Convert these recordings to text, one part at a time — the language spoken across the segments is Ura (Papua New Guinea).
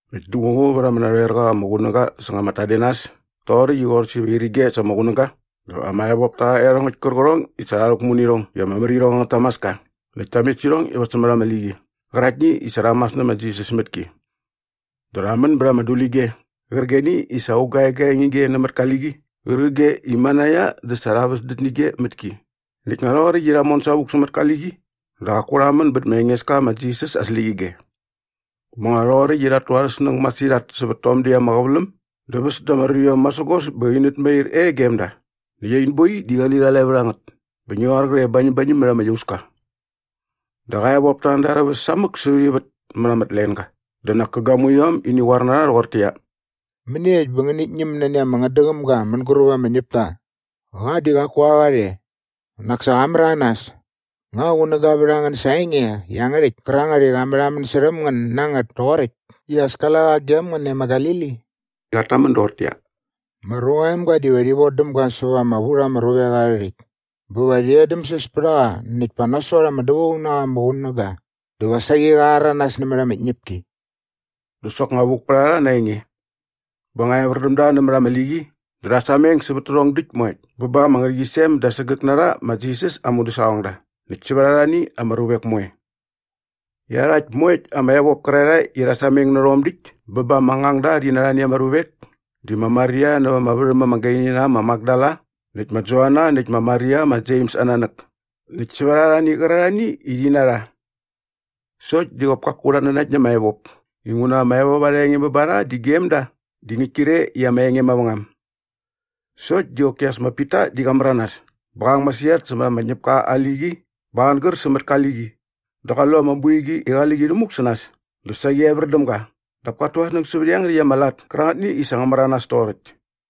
Näkt duququ vät ama narhoerqa ama qunäga säng ama tadenas toqoräkt i qorhäs iva irige sa ama qunäga dä ama evop ta rha iarhongäkt kärqärhong i sa rha rhäkmu nä irhong i ama mär irhong angät tamaska näkt ta met sä irhong iva sämät ama liqi qäraktni i sa rha mas nä ma Jisas mät ki. Dä rha män bät ama dulige qärqigeni i sa aung ga egaeng ige nämät ka liqi qärqige i manaia dä sa rha väsdät nä ige mät ki näkt nga rhoqoräkt i rha mon savuk sämät ka liqi dä qaku rha män bät ma Engeska ma Jisas aa släqyige. Bä nga rhoqoräkt i rhat tu arhä snäng masirhat sävät tom däkt ama qäväläm dä väs da ama ruiom masägos bä inät mair e gem da näkt ain boi di qaliqalae vät a ngät bä ngi qoar qre bañämbañäm mät ama iauska. Dä qa evop ta an da arhä väs samäk sävät ivät mät ama tlenga dä nak kä gamuiom ini qoar na rha rhoqortäqyia, “Mäniekt bä ngänit ñäm nani ama ngätdäqämga mänguräp ama ñäpta? Qa di qaku a qa rhe. Nak sa qa märanas! Nga qunäga vät a ngän sa aa enge iangärhäkt kärangät i qa märhamän särhäm ngän na ngät toqoräkt i as kale qa gem ngän e ma Galili?” Qat tamän doqortäqyia, “Ma Ruqa aa Emga diva rhi vodäm ga säva ama vu rha ama ruvek arhä rhäkt bä va rhi edämsäs pät a qa näkt pa nasot ama dävaung na qa ama qunäga dä va saqi qa rhäranas nämät ama tñäpki.” Dä soknga vuk pät a rha na aa enge. Bä nga evär däm da nämät ama liqi dä rha sameng sävät tärhong däkt moekt bä ba ama ngärhäqyisem da sägäk na rha ma Jisas aa mudäsaqongda näkt sävät arhani ama ruvek moe. Iarhakt moekt ama evop kärarhae i rha sameng nä rhom däkt bä ba ama ngangda rhi na arhani ama ruvek di ma Maria näva ama värhäm ama gaini na äm ma Makdala näkt ma Joana näkt ma Maria ma Jems aa nanäk näkt sävät arhani kärarhani i rhi na rha. Sokt di qop kaku rhat nanakt na ama evop inguna ama evop arha enge bä ba rha di gem da di ngäkt kre i ama enge mavängam. Sokt di qoki as ma Pita di qa märanas bä qa ang masirhat sämät ama ñäpka aa liqi bä qa angär sämät ka liqi dä qa lu ama boiqi i qali qi rhämuk sä nas dä saqi evär däm ga dap kat tu aa snäng sävät iangärhäkt ama lat kärangätni i sa ngä märanas toqoräkt.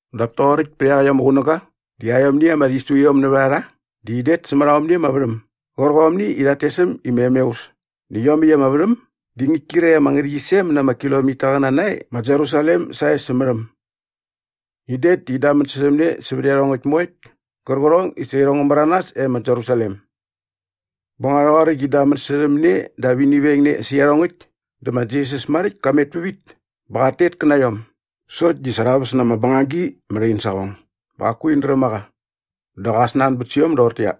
Dap toqoräkt pät iaqäkt ama qunäga di aiomni ama rhisuiom nävät a rha di in det sämät aomni ama värhäm gärqomni i rhat tes äm i ma Emeus näkt iomäkt ama värhäm di ngäkt kre ama ngärhäqyisem na ama kilomitaqäna nae ma Jerusalem sae sämät äm. In det dä in damän särhäm ne sävät iarhongäkt moekt kärqärhong i sa irhong ngä märanas e ma Jerusalem. Bä nga rhoqoräkt i in damän särhäm ne dap ini veng ne sä iarhongäkt dä ma Jisas maräkt ka met pävit bä qat tet kä na iom sokt di sa rha väs na ama bängagi mät ain saqong bä qaku in dräm a qa. Dä qa snanbät sä iom doqortäqyia,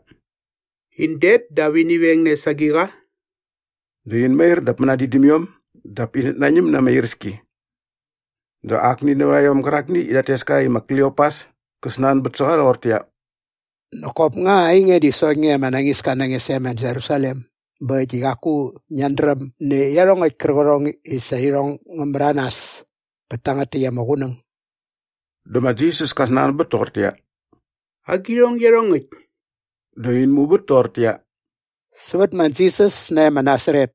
“In det dap ini veng ne sa agiqa?” Dä in mair dap mänadin däm iom dap inät nañäm na ama iräski. Dä akni nävät a iom gärakni i rhat tes ka i ma Kliopas kä snanbät sä qa rhoqortäqyia, “Nak kop nga ainge di sokt nge ama nañiska na nge sae ma Jerusalem bä äkt i qaku ngiat dräm nä iarhongäkt kärqärhong i sa irhong ngä märanas bät tangät täkt ama qunäng?” Dä ma Jisas ka snanbät toqortäqyia, “Agirhong iarhongäkt?” Dä in muvät toqortäqyia, “Sävät ma Jisas nae ma Nasaret.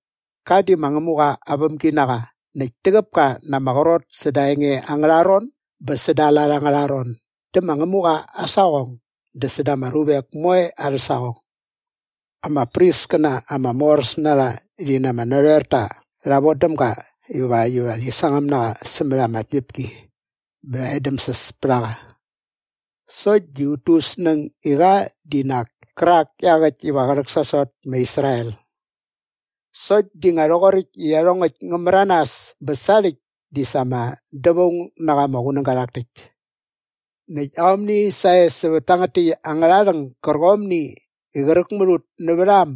Qa di ma Ngämuqa aa vämginaqa näkt täqäp ka na ama qrot säda aa enge angärha ron bä säda aa lat angärha ron dä ma Ngämuqa aa saqong dä säda ama ruvek moe arhä saqong. Ama priskäna ama moräs na rha rhi na ama narhoerta rha vodäm ga ivakt iva rhi sangäm na qa sämät ama tñäpki bä rha edämsäs pät a qa sokt di ut tu ut snäng i qa di nak kärak iaqäkt iva qä rhäksasot ma Israel. Sokt di nga rhoqoräkt i iarhongäkt ngä märanas bä sarhäkt di sa ama dävaung na qa ama qunäga rhak täkt. “Näkt aomni sae sävät tangät täkt angärha rhäng gärqomni i qräk mät ut nävät a äm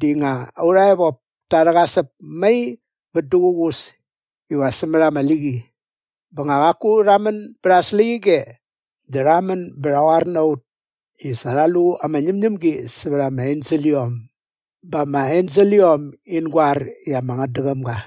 di nga aurha evop ta rhäqasäp mai vät duququs iva sämät ama liqi bä nga qaku rha män bät aa släqyige dä rha män bä rha qoar na ut i sa rha lu ama ñämñämgi sävät ama enseliom bä ama enseliom in goar i ama ngätdäqäm ga.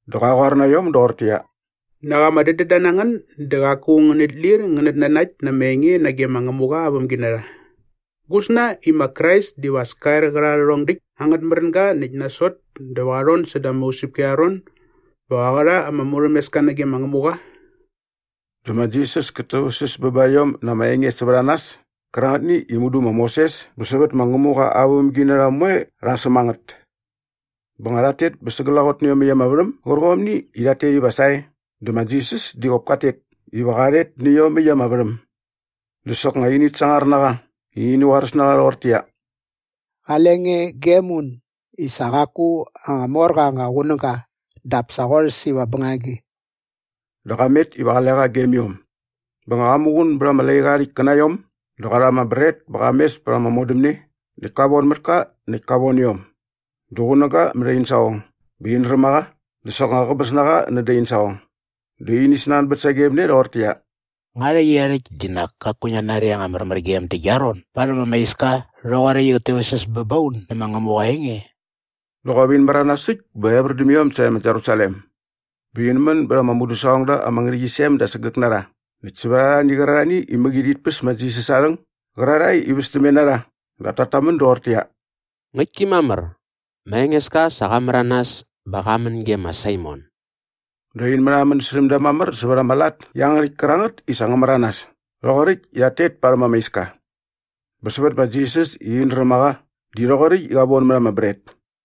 Dä qa qoar na iom doqortäqyia, “Nak ama dädända na ngän dä qaku ngänit lir ngänät nanakt na ama enge nage ma Ngämuqa aa vämginarha. Gusna i ma Krais diva as ka er qä rha rhärhong däkt angät märänga näkt sa nasot dä va qa rhon säda ama usäpki arha ron bä qä rha ama murhämeska nage ma Ngämuqa?” Dä ma Jisas kät täväktsäs bä ba iom na ama enge sävät a nas kärangätni i mudu ma Moses bä sävät ma Ngämuqa aa vämginarha moe rha säm a ngät. Bä nga rhat tet bä sa glaqot nä iomäkt ama värhäm gärqomni i rhat tet iva sae dä ma Jisas di qop kat tet iva qa rhet nä iomäkt ama värhäm. Dä soknga init sangar na qa i ini qoaräs na qa rhoqortäqyia, “Qale nge gem un i sa qaku anga mor qa anga qunäga dap sa qorhäs iva bängagi.” Dä qa met iva qale qa gem iom. Bä nga qa muqun bät ama laiqa aa rhäkt kä na iom dä qa rha ama bret bä qa mes pät ama modämne näkt ka von mät ka näkt ka von iom. Dä qunäga mät in saqong bä in räm a qa dä soknga qäbäs na qa nädä in saqong. Dä ini snanbät sagem ne rhoqortäqyia, “Nga rhäqyerhäkt di nak kaku ngiat nari ama märmärgem dä gia ron barhäm ama iska rhoqoräkt i qät täväktsäs bä ba un nä ma Ngämuqa aa enge?” Dä qop in märanas äkt bä evär däm iom sae ma Jerusalem. Bä in män bät ama mudäsaqongda ama ngärhäqyisem da sägäk na rha näkt sävät arhani qärarhani i mäqi rhit päs ma Jisas aa rhäng gärarhae i västämne na rha dap tat tamän doqortäqyia, “Ngäktki mamär, ma Engeska sa qa märanas bä qa män ge ma Saimon.” Dä in märhamän särhäm da mamär sävät ama lat iangärhäkt kärangät i sa ngä märanas toqoräkt i rhat tet parhäm ama iska. Bä sävät ma Jisas i in dräm a qa di rhoqoräkt i qa von mät ama bret.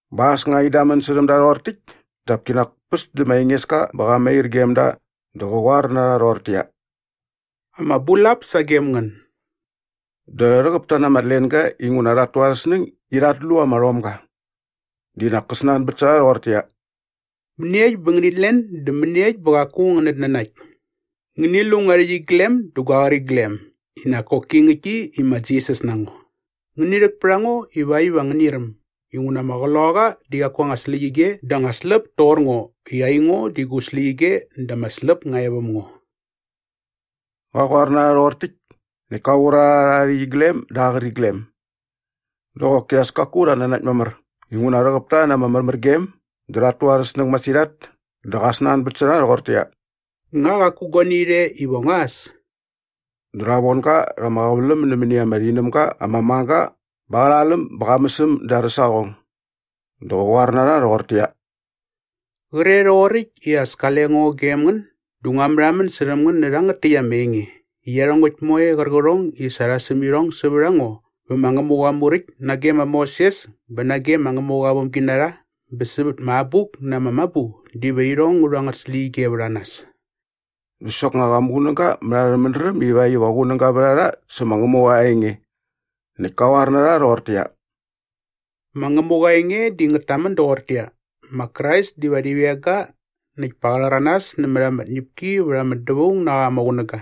Bä as nga in damän särhäm da rhoqor täkt dap kinak päs dä ma Engeska bä qa mair gem da dä qä qoar na rha rhoqortäqyia, “Ama bulap sagem ngän.” Dä rhäqäp ta na ama tlenga inguna rhat tu arhä snäng i rhat lu ama rhomga. Di nak kä snanbät sä rha rhoqortäqyia, “Mäniekt bä ngänit len dä mäniekt bä qaku ngänät nanakt? Ngäni lu ngua rhäqyiglem dä gua qäriglem i nak koki ngäktki i ma Jisas na ngo. Ngäni rhäk pät a ngo ivakt iva ngäni räm inguna ama qloqaqa di qaku aa anga släqyige dä anga släp toqor ngo i aingo di gu släqyige dä ama släp nga e väm ngo.” Qa qoar na rha rhoqor täkt näkt ka qur a rha rha aa rhäqyiglem dä aa qäriglem. Dä qoki as kaku rhat nanakt mamär inguna rhäqäp ta na ama märmärgem dä rhat tu arhä snäng masirhat dä qa snanbät sä rha rhoqortäqyia, “Nga qaku guani rhe iva ngua äs?” Dä rha von ga rha ama qäväläm nämäni ama rhinämga ama mang ga bä qa rha läm bä qa mäs äm da arhä saqong. Dä qä qoar na rha rhoqortäqyia, “Qre rhoqoräkt i as kale ngo gem ngän dä ngua märhamän särhäm ngän nä rhangät täkt ama enge i iarhongäkt moe qärqärhong i sa rha säm irhong sävät a ngo vä ma Ngämuqa aa Muräkt nage ma Moses bä nage ma Ngämuqa aa vämginarha bä sävät ama Abuk na ama Mabu diva irhong ngä rhu angät släqyige vät a nas.” Dä soknga qa muqunäga mät arhä mädräm ivakt iva qunäga vät a rha sä ma Ngämuqa aa enge. Näkt ka qoar na rha rhoqortäqyia, “Ma Ngämuqa aa enge di ngät tamän doqortäqyia, ‘Ma Krais diva rhi veng ga näkt pa qa rhäranas nämät ama tñäpki vät ama dävaung na qa ama qunäga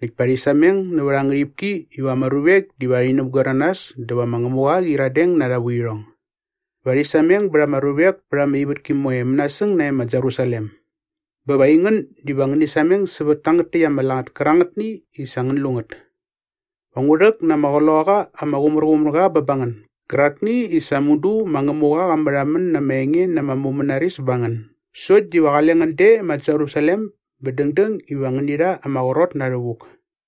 näkt pa rhi sameng nävät aa ngärhipki iva ama ruvek diva rhi näpgoer na nas dä va ma Ngämuqa qä qyiradeng na arha vuirhong. Va rhi sameng bät ama ruvek pät ama ivätki moe mänasäng nae ma Jerusalem.’ Bä va aingän diva ngäni sameng sävät tangät täkt ama lat kärangätni i sa ngän lu ngät. Va ngu rhäk na ama Qloqaqa ama Qumärqumärqa bä ba ngän gärakni i sa mudu ma Ngämuqa qa märhamän na ama enge na ama mumänaris ba ngän sokt diva qale ngän de ma Jerusalem bä dängdäng iva ngäni rha ama qrot na rhävuk.”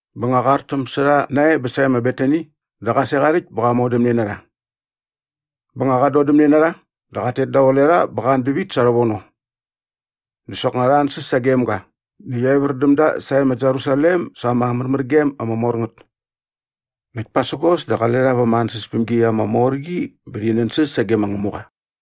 Bä nga qa artäm sä rha nae bä sae ma Betani dä qa sek aa rhäkt bä qa modämne na rha. Bä nga qat dodämne na rha dä qat tet daqule rha bä qa an dävit sa rhävono. Dä soknga rha ansäs sagem ga näkt evär däm da sae ma Jerusalem sa ama märmärgem ama mor ngät. Näkt pasägos dä qale rha va ama ansäspämgi ama mor qi bä rhi nänsäs sage ma Ngämuqa.